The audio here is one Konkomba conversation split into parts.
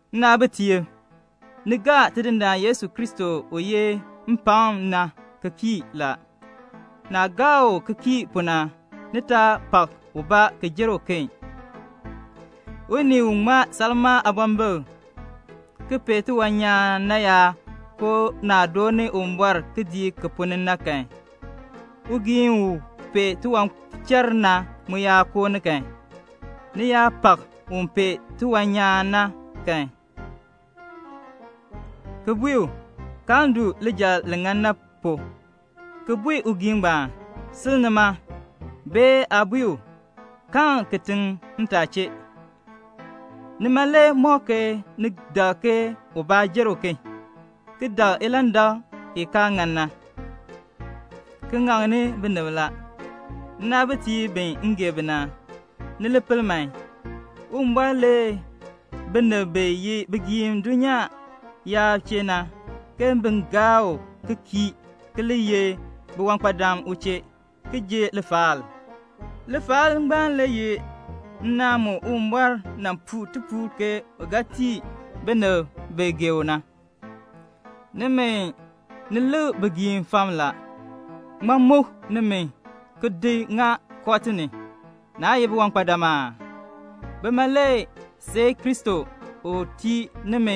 Nnaabitiib, ni gaa Tidindaan Yesu Kristo u yeh mpakm na ki kii la. Naah gaa u ki kii pu na, ni taa pak ubaa ki jer uken. Unii u ŋmaa salmaa aabɔmbik ki pee tiwan nyaan na yaa koo naah dooni Uwumbɔr kidiik ki ponn ni na kan, ugiin u pee tiwanchar na mu yaa koo ni kan, ni yaa pak un pee tiwan nyaan na kan, ki bui u, "Kaln du lijal li ŋan na pu," ki bui ugiin ngbaan, "Sil nima," bee aa bui u, "Kaln kitiŋ ntaa chee," nima le mɔk ke ni dak ke ubaa jer uken, ki dak ilandak i kaa ŋan na, ki ŋaŋni binib la. Nnaabitiib bi m gee bi na, ni li pel man. Uwumbɔr lee binib bi ye bigiim dulnyaa yaab chee na, ke bin gaa u ki kii ki li ye biwankpadam u chee, ki ji lifaal. Lifaal ngbaan le ye nnaan mu Uwumbɔr nan puu tipuul ke u ga tii binib bi gee u na. Nimi, ni lik bigiim fam la. Ŋmaa muk nimi ki di ŋa kooti ni? Naa ye biwankpadam aa? Bima le seei Kristo u tii nimi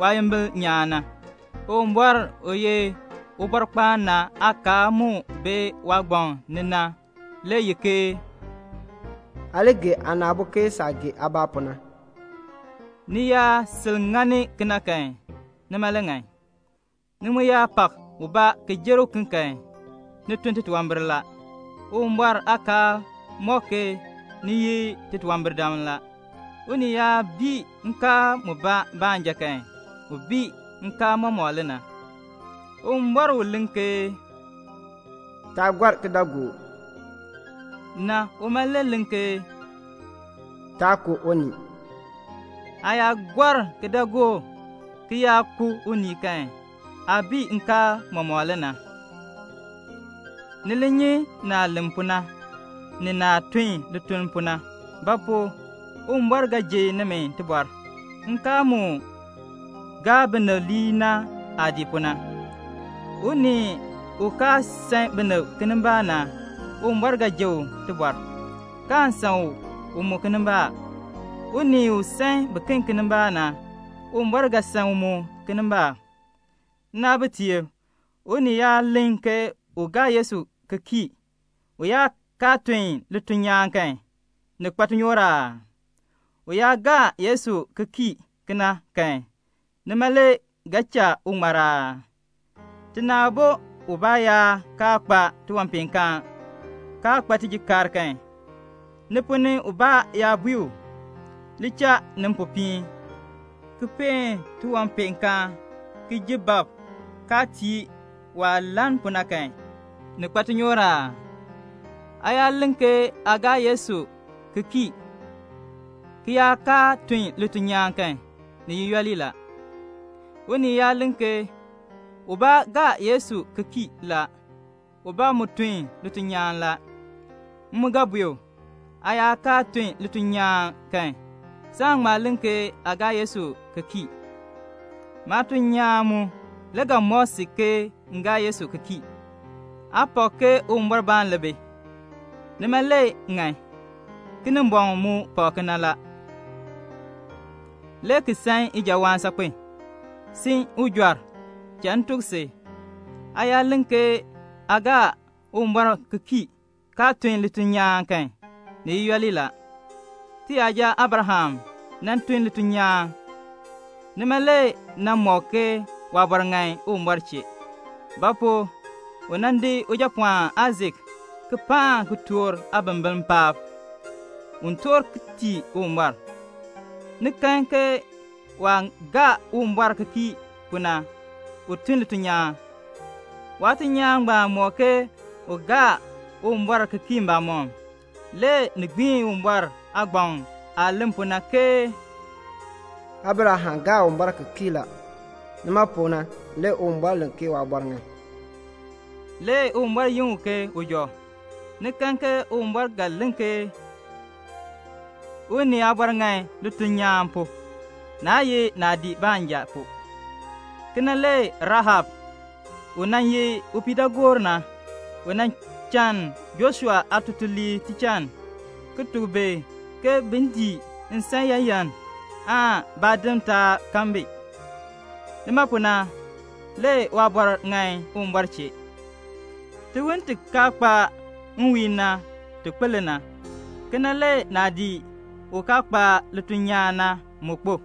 waayimbil nyaan na. Uwumbɔr u ye Ubɔrkpaan na aakaal mu bi waagbaŋ ni na le ye ke "Aa li gee aana aabo ke saah gee aabaa pu na." Ni yaa sil ŋani kena kan, nima le ŋan. Ni mu yaa pak ubaa ki jer uken kan, ni tun titunwambir la. Uwumbɔr aakaal mɔk ke ni ye titunwambirdam la. Unii yaa bii nkaal mubaa baanja kan, u bii nkaal mɔmɔk le na. Uwumbɔr u len ke "Taa gɔr kidaagook" na, uma le len ke "Taa ku unii." Aa yaa kaa gɔr kidaagook, ki yaa ku unii kan, aa bii nkaal mɔmɔk le na. Ni li nyi naah len pu na, ni naah tun lituln pu na; ba pu? Uwumbɔr ga ji nimi tibɔr, nkaal mu gaa binib lii na aah dii pu na. Unii u kaa san binib kinimbaak na, Uwumbɔr ga ji u tibɔr, kaan san u mu kinimbaak. Unii u san biken kinimbaak na, Uwumbɔr ga san u mu kinimbaak. Nnaabitiib, unii yaa len ke u gaa Yesu ki kii, u yaa kaa tun lituln nyaan kan, ni kpa tinyoor aa? U yaa gaa Yesu ki kii kena kan, nima le ga cha u ŋmar aa? Tina aabo ubaa yaa kaa kpa tiwanpeenkaan, kaa kpa tijikaar kan, ni ponn ni ubaa yaa bui u, "Li cha ni mpopiin, ki peen tiwanpeenkaan, ki ji bab," kaa tii u waah lann pu na kan, ni kpa tinyoor aa? Aa yaa len ke aa gaa Yesu ki kii ki yaa kaa tun lituln nyaan kan, ni ye yooli le na. Unii yaa len ke, "Ubaa gaa Yesu ki kii la, ubaa mu tun lituln nyaan la," m mu ga bui u, "Aa yaa kaa tun lituln nyaan kan, saan ŋma len ke aa gaa Yesu ki kii. Maatuln nyaan mu le ga mɔk si ke m gaa Yesu ki kii." Aa pak ke Uwumbɔrbaan le bi. Nima le ŋan. Kinimbɔŋ mu pak kena, le ki san ijawaan saakpen. Si ujɔr, cha m tuk si, aa yaa len ke aa gaa Uwumbɔr ki kii, kaa tun lituln nyaan kan, ni ye yooli la. Tiyaja Abraham nan tun lituln nyaan. Nima le nan mɔk ke waabɔr ŋan Uwumbɔr chee; ba pu? u nan di ujapɔɔn Aisak ki paan kitork aabimbiln paab, un toor ki tii Uwumbɔr. Ni kan ke waah gaa Uwumbɔr ki kii pu na, u tun lituln nyaan. Waatuln nyaan ngbaan mɔk ke u gaa Uwumbɔr ki kii mbamɔm. Le ni gbiin Uwumbɔr aagbaŋ aah len pu na, ke "Abraham gaa Uwumbɔr ki kii la. Nima pu na le Uwumbɔr len ke waabɔr ŋan." Le Uwumbɔr yin u ke ujɔ. Ni kan ke Uwumbɔr ga len ke unii aabɔr ŋan lituln nyaan pu, naa ye naadii baanja pu. Kena le Rahab u nan ye upiidaagoor na, u nan chann Joshua aatutuliib tichann, ki tuk bi ke bin dii nsan yaayan aan baadim taa kan bi. Nima pu na le waabɔr ŋan Uwumbɔr chee. Tiwon ti kaa kpa nwiin na, ti kpo le na, kena le naadii u kaa kpa lituln nyaan na mu kpo.